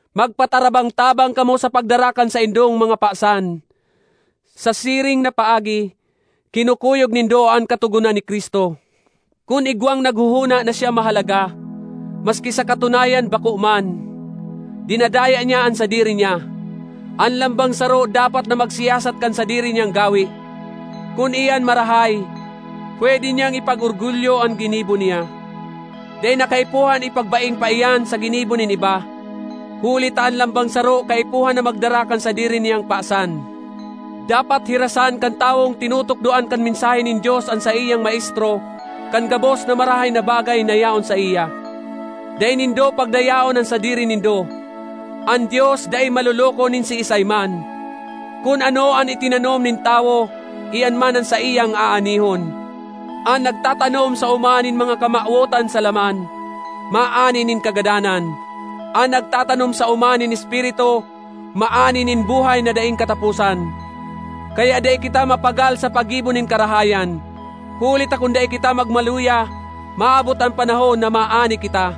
Magpatarabang-tabang kamo sa pagdara kan saindong mga pasan; sa siring na paagi, kinukuyog nindo an katogonan ni Cristo. Kun igwang naghohona na siya mahalaga, maski sa katunayan bako man, dinadaya niya an sadiri niya. An lambang saro dapat na magsiyasat kan sadiri niyang gawe. Kun iyan marahay, pwede niyang ipag-orgulyo an ginibo niya; dai na kaipuhan ipagbaing pa iyan sa ginibo nin iba. Huli ta an lambang saro kaipuhan na magdara kan sadiri niyang pasan. Dapat hirasan kan tawong tinutukdoan kan mensahe nin Dios an saiyang maestro kan gabos na marahay na bagay na yaon saiya. Dai nindo pagdayaon an sadiri nindo; an Dios dai maloloko nin siisay man. Kun ano an itinanom nin tawo, iyan man an saiyang aanihon. An nagtatanom sa oma nin mga kamawotan sa laman, maani nin kagadanan; an nagtatanom sa oma nin Espiritu, maani nin buhay na daing kataposan. Kaya dai kita mapagal sa paggibo nin karahayan; huli ta kun dai kita magmaluya, maabot an panahon na maani kita.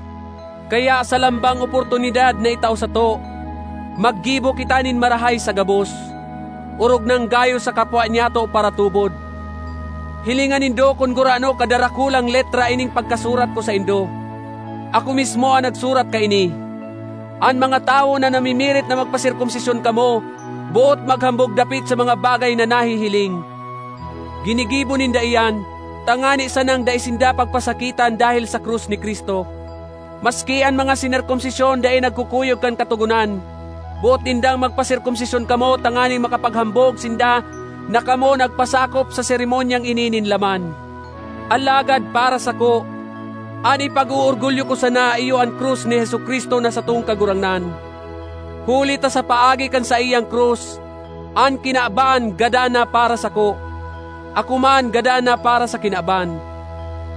Kaya sa lambang oportunidad na itao sato, maggibo kita nin marahay sa gabos, orog nang gayo sa kapwa nyato paratubod. Hilinga nindo kun gurano kadarakulang letra ining pagkasurat ko saindo; ako mismo an nagsurat kaini! An mga tawo na namimirit na magpaserkomsisyon kamo boot maghambog dapit sa mga bagay na nahihiling. Ginigibo ninda iyan, tangani sanang dai sinda pagpasakitan dahel sa krus ni Cristo. Maski an mga sinerkomsisyon dai nagkukuyog kan Katogonan; boot nindang magpaserkomsisyon kamo tanganing makapaghambog sinda na kamo nagpasakop sa seremonyang ini nin laman. Alagad para sako, an ipag-oorgulyo ko sana iyo an krus ni Jesu-Cristo na satong Kagurangnan, huli ta sa paagi kan saiyang krus, an kinaban gadan na para sako; ako man gadan na para sa kinaban.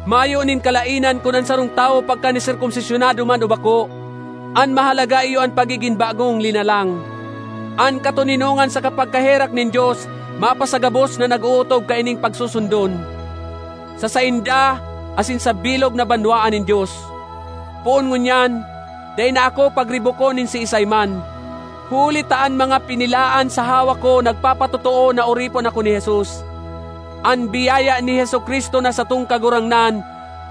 Mayo nin kalaenan kun an sarong tawo pagkaniserkomsisyonado man o bako; an mahalaga iyo an pagigin bagong linalang. An katoninongan saka pagkaherak nin Dios mapasagabos na nag-ootob kaining pagsusundon—sa sainda asin sa bilog na banwaan nin Dios! Poon ngunyan, dai na ako pagribokon nin siisay man, huli ta an mga pinilaan sa hawak ko nagpapatotoo na oripon ako ni Jesus. An biyaya ni Jesu-Cristo na satong Kagurangnan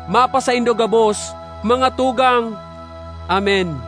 mapasaindo gabos, mga tugang. Amen.